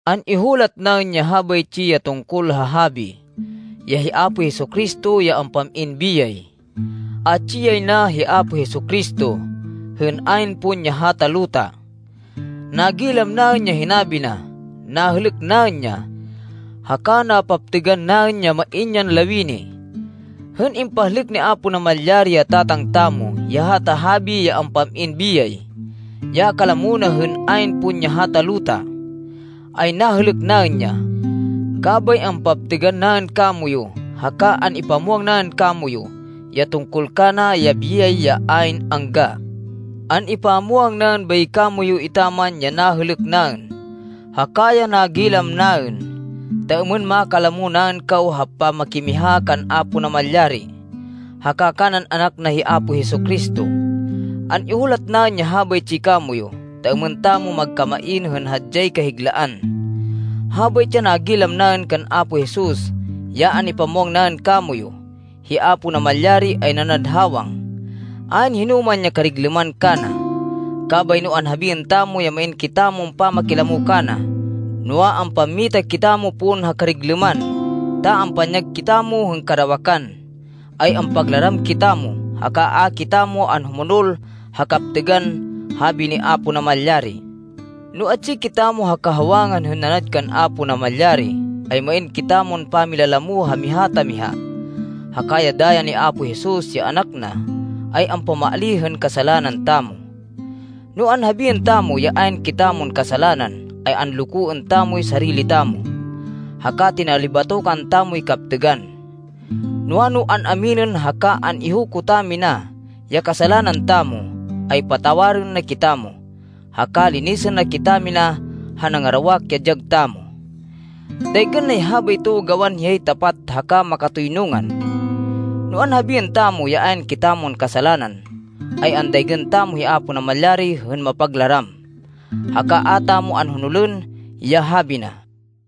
An-ihulat naên ya habaytsi, ya tungkol ha habi, ya hi Apo Jesu-Cristo, ya ampam-in biyay. Atsi yay na hi Apo Jesu-Cristo, hên ayn pon ya hata luta. Nagilam naên ya hinabi na. Nahêlêk naên ya. Haka napaptêgan naên ya main yan lawini. Hên impahlêk ni Apo Namalyari, ya Tatang tamo, ya hata habi ya ampam-in biyay, ya kalamo na hên ayn pon ya hata luta, ay nahêlêk naên ya. Kabay ampaptêgan naên kamoyu, haka an-ipamwang naên kamoyu, ya tungkol kana, ya biyay ya ayn angga. An-ipamwang naên bay kamoyu etaman, ya nahêlêk naên, haka ya nagilam naên, ta êmên makalamo naên kaw ha pamakimiha kan Apo Namalyari, haka kanan Anak na hi Apo Jesu-Cristo. An-ihulat naên ya habaytsi kamoyu, ta êmên tamo magkamain hên hadyay kahiglaan. Habaytsi ya nagilam naên kan Apo Jesus ya an-ipamwang naên kamoyu: Hi Apo Namalyari ay nanad hawang. Ayn hinoman ya kariglêman kana. Kabay no anhabiên tamo ya main kitamon pamakilamo kana, noa, ampammita kitamo pon ha kariglêman, ta ampanyag kitamo hên karawakan, ay ampaglaram kitamo, haka a kitamo anhumonol ha kaptêgan habi ni Apo Namalyari. No atsi kitamo ha kahawangan hên nanad kan Apo Namalyari, ay main kitamon pamilalamo ha miha ta miha, haka ya daya ni Apo Jesus, ya Anak na, ay ampamaalíh hên kasalanan tamo. No anhabiên tamo, ya ayn kitamon kasalanan, ay anlokoên tamoy sarili tamo, haka tinalibatokan tamoy kaptêgan. Noa, no an-aminên haka an-ihuko tamina ya kasalanan tamo, ay patawarên na kitamo, haka linisên na kitamina ha nangarawak ya dyag tamo. Daygên nay habayto gawan hiyay tapat haka makatoynungan. No anhabiên tamo, ya ayn kitamon kasalanan, ay andaygên tamo hi Apo Namalyari hên mapaglaram, haka a tamo anhonolên ya habi na.